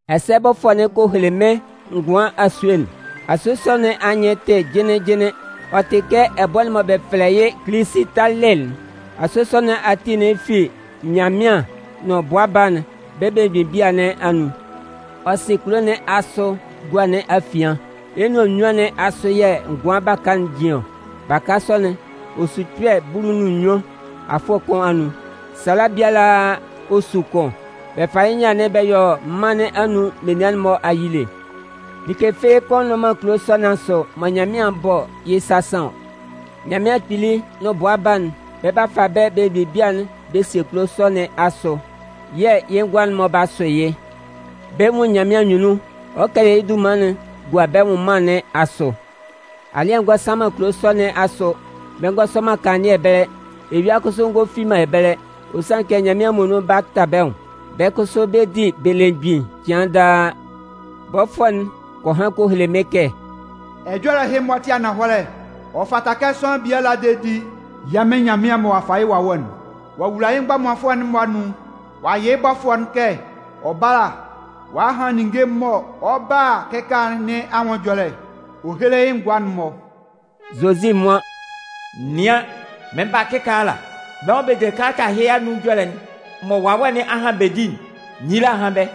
Ɛsɛ bɔfʋɛ'n kɔ hele mɩ́n ngʋan asue'n. Asue sɔ nɩn anyɩn'n tɩ jɩnlɩn jɩnlɩn, ɔ tɩ kɛ ɛbʋɛ'n mɔ bɛ fɛlɛ yɩ́ Kilisitalɩ'n. Asue sɔ nɩn ati'n fi Nyanmɩan nʋn Bʋa Baa'n bɛ́ belemgbin bia nɩn anun. Ɔ sɩn kulo nɩn asʋ gua nɩn afian. Yɩ́ nʋan nnyuan nɩn asʋ yɛ̂ ngʋan baka'n jin ɔ. Baka sɔ'n, ɔ su kpɛ̂ bulu nʋn nnyuan afʋɛ kʋn anʋan. Sala biala ɔ su kʋn. Bɛ fa yɩ́ nyâ'n bɛ yɔ mân nɩn anun menian'n-mɔ ayile. Like fɩ́ɩ́ kʋ́n nnʋn man kulo sɔ nɩn asʋ mɔ Nyanmɩan 'bɔ yɩ́ sasan ɔ. Nyanmɩan Kpili nʋn Bʋa Baa'n, bɛ 'ba fa bɛ́ belemgbin bia'n bɛ sie kulo sɔ nɩn asʋ, yɛ̂ yɩ́ ngʋa'n-mɔ 'ba sʋ yɩ́. Bɛ 'nwun Nyanmɩan anyunnun, ɔ 'kɛlɛ yɩ́ dunman'n gua bɛ́ nwʋnman nɩn asʋ. Alɩ́ɛ ngɔ san man kulo sɔ nɩn asʋ, bɛ ngɔ sɔ man kanlannɩɛ ɛbɛlɛ, eyua kʋsʋ ngɔ fi man ɛbɛlɛ, ɔ sanlɩn kɛ Nyanmɩan muonun 'ba ta bɛ́ nwʋn. Bɛ́ kʋsʋ bɛ 'di belemgbin cɩan daa. Bɔfʋɛ'n kɔ han kɔ hele mɩ́n kɛ: “Ɛjɔlɛ ɛhɩ-mɔ tɩ ananhɔlɛ, ɔ fata kɛ sʋanlan biala de di. Yɛ́ Mɩn Nyanmɩan mɔ ɔ'a fa yɩ́ Wawɛ'n ɔ'a wula yɩ́ mgbɔmanfʋɛ'n-mɔ anun'n, ɔ a yɩ́ bɔfʋɛ'n kɛ ɔ bála ɔ'a han ninnge mɔ ɔ 'ba a kɩkaala nɩn anwʋn ɛjɔlɛ ɔ héle yɩ́ ngʋa'n-mɔ.” Zozi nwan: “Nɩan, mɩn 'ba kɩkaala! Bɛ́ mɔ bɛ de kalata ɛhɩ anun ɛjɔlɛ'n mɔ Wawɛ nɩn a han'n bɛ di'n, nyila hán bɛ́.”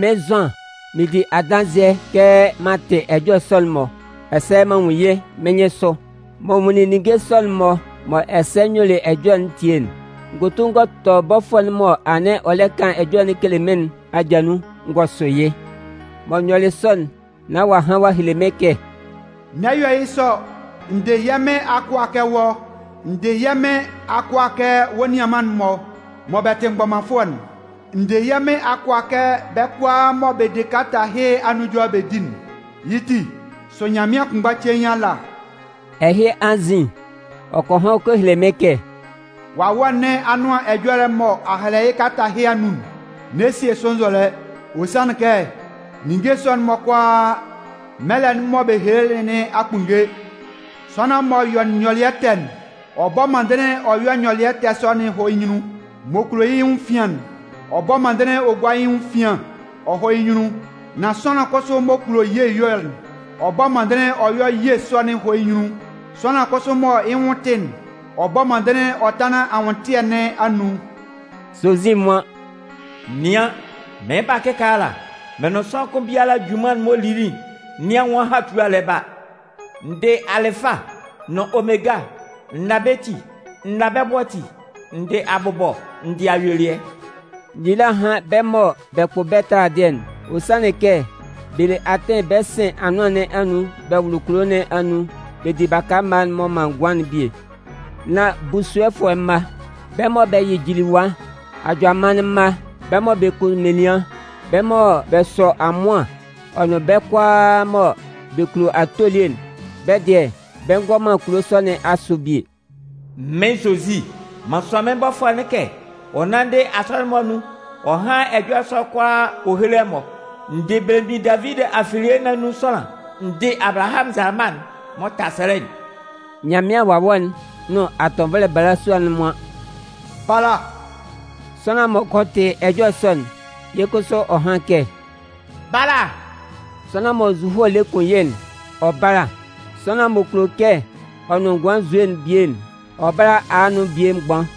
Mɩ́n Zʋan, mɩɩn di adanzɩɛ kɛ m'an tɩ ɛjɔlɛ sɔ'n-mɔ, ɛsɛ m'an nwun yɩ́ mɩ́n nyɩnsʋ. Mɔ n nwunlin ninnge sɔ'n-mɔ, mɔ ɛsɛ n yuelɩ ɛjɔlɛ'n tie'n, n gɔ tu n gɔ tɔ bɔfʋɛ'n m'ɔ anɩn ɔ lɛ kan ɛjɔlɛ'n kele mɩ́n nɩn aja nun n gɔ sʋ yɩ́. Mɔ n yɔlɩ sɔ'n nán ɔ'a han ɔ'a hele mɩ́n kɛ: “N'ɛ yɔ yɩ́ sɔ! N dɩ yɛ́ Mɩn akʋa kɛ wɔ́. N dɩ yɛ́ Mɩn akʋa kɛ wɔ́ nianman'n-mɔ mɔ bɛ tɩ mgbɔmanfʋɛ'n. N dɩ yɛ́ Mɩn akʋa kɛ bɛ́ kʋalaa mɔ bɛ de kalata ɛhɩ anun ɛjɔlɛ'n bɛ di'n. Yɩ́ ti, sʋ Nyanmɩan kʋnmgba cein ala.” Ɛhɩ anzin, ɔ kɔ han kɔ hele mɩ́n kɛ: “Wawɛ nɩn Anʋan Ɛjɔlɛ'n mɔ a hɛlɛ yɩ́ kalata ɛhɩ anun'n, n'ɛ sie sʋ nzɔlɛ. Ɔ sanlɩn kɛ ninnge sɔ'n-mɔ kʋalaa mɛlɛ'n mɔ bɛ helelɩ nɩn a kpunnge. Sʋanlan m'ɔ yɔ nyɔlɩɛ ɛtɛ'n, ɔ bɔ́ mɔndɩnlɩn ɔ yɔ́ nyɔlɩɛ ɛtɛ sɔ'n ɔ hɔ́ yɩ́ nyunnun. M'ɔ kulo yɩ́ nwʋn efian'n, ɔ bɔ́ mɔndɩnlɩn ɔ gúa yɩ́ nwʋn efian ɔ hɔ́ yɩ́ nyunnun. Nan sʋanlan kʋsʋ m'ɔ kulo ye ɛyɔlɛ'n, ɔ bɔ́ mɔndɩnlɩn ɔ yɔ́ ye sɔ'n ɔ hɔ́ yɩ́ nyunnun. Sʋanlan kʋsʋ mɔ yɩ́ nwʋn tɩ'n, ɔ bɔ́ mɔndɩnlɩn ɔ tánlan anwʋntɩɛ nɩn anun.” Zozi nwan: “Nɩan, mɩn 'ba kɩkaala! Mɩn nʋn sʋanlan kʋn biala junman'n m'ɔ lili nɩn anwʋn ahatua lɛ ba. N dɩ Alɩfa nʋn Omega, n na bɛ́ ti, n na bɛ́ bʋ ati, n dɩ abʋbɔ n dɩ ayuelɩɛ.” Nyila hán bɛ́ mɔ bɛ kpʋ bɛ́ taladɩɛ'n. Ɔ sanlɩn kɛ bɛ le atɩn bɛ sɩn anʋan nɩn anun bɛ wʋlʋ kulo nɩn anun bɛ di baka mma'n m'ɔ man ngʋan'n bie. Nan busuɔfʋɛ mma, bɛ́ mɔ bɛ yɩ jiliwa, ajʋamannɩn mma, bɛ́ mɔ bɛ kun menian, bɛ́ mɔ bɛ sɔ amʋan ɔ nʋn bɛ́ kʋalaa mɔ bɛ kulo ato elie'n, bɛ́ dɩɛ, bɛ ngɔ man kulo sɔ nɩn asʋ bie. “Mɩ́n Zozi, m'an sʋan mɩ́n bɔfʋɛ'n kɛ ɔ nánndɩ Asɔnɩn'n-mɔ anun ɔ hán ɛjɔlɛ sɔ'n kʋalaa ɔ héle ɛmɔ. N dɩ belemgbin Davidi afilie nɩn anun sʋanlan. N dɩ alɩbahɩan nzalama'n m'ɔ ta sɛlɛ'n”. Nyanmɩan Wawɛ'n nʋn atɔnvɔlɛ balasua'n nwan: “Bala!” Sʋanlan m'ɔ kɔ tɩ ɛjɔlɛ sɔ'n, yɩ́ kʋsʋ ɔ hán kɛ: “Bala!” Sʋanlan mɔ nzuhoe lɛ kun yɩ́'n, ɔ bála. Sʋanlan m'ɔ kulo kɛ ɔ nʋn ngʋan nzue'n bie'n, ɔ bála a nʋn bie mgban.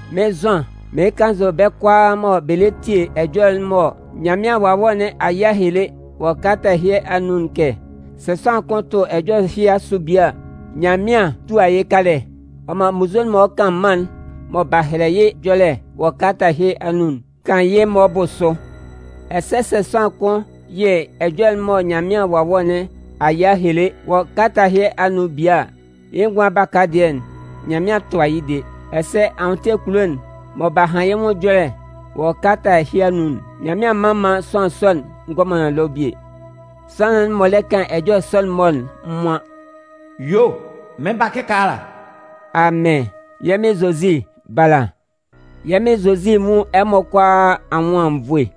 Mɩ́n Zʋan, mɩɩn kannzʋ bɛ́ kʋalaa mɔ bɛ lɛ tie ɛjɔlɛ'n mɔ Nyanmɩan Wawɛ nɩn a yɩ a hele wɔ kalata ɛhɩ anun'n kɛ: Sɛ sʋanlan kʋn tʋ ɛjɔlɛ ɛhɩ asʋ bie a, Nyanmɩan 'tua yɩ́ kalɛ ɔ man munnzue'n mɔ ɔ 'kan mân'n mɔ b'a hɛlɛ yɩ́ ɛjɔlɛ wɔ kalata ɛhɩ anun'n kan yɩ́ maan ɔ bʋ sʋ. Ɛsɛ sɛ sʋanlan kʋn yɩ ɛjɔlɛ'n mɔ Nyanmɩan Wawɛ nɩn a yɩ a hele wɔ kalata ɛhɩ anun'n bie a, yɩ́ ngʋan baka baa dɩɛ'n, Nyanmɩan 'tʋa yɩ́ de. Ɛsɛ anwʋntɩɛ kulo'n mɔ b'a han yɩ́ nwʋn ɛjɔlɛ wɔ kalata ɛhɩ anun'n, Nyanmɩan mman man sʋanlan sɔ'n ngɔ man ɛlɔ bie. Sʋanlan'n m'ɔ lɛ kan ɛjɔlɛ sɔ'n-mɔ'n nwan: “Yuo, mɩn 'ba kɩkaala.” Amɩn! Yɛ́ Mɩn Zozi, bala! Yɛ́ Mɩn Zozi nwún ɛmɔ kʋalaa anwʋn anwunnvoe!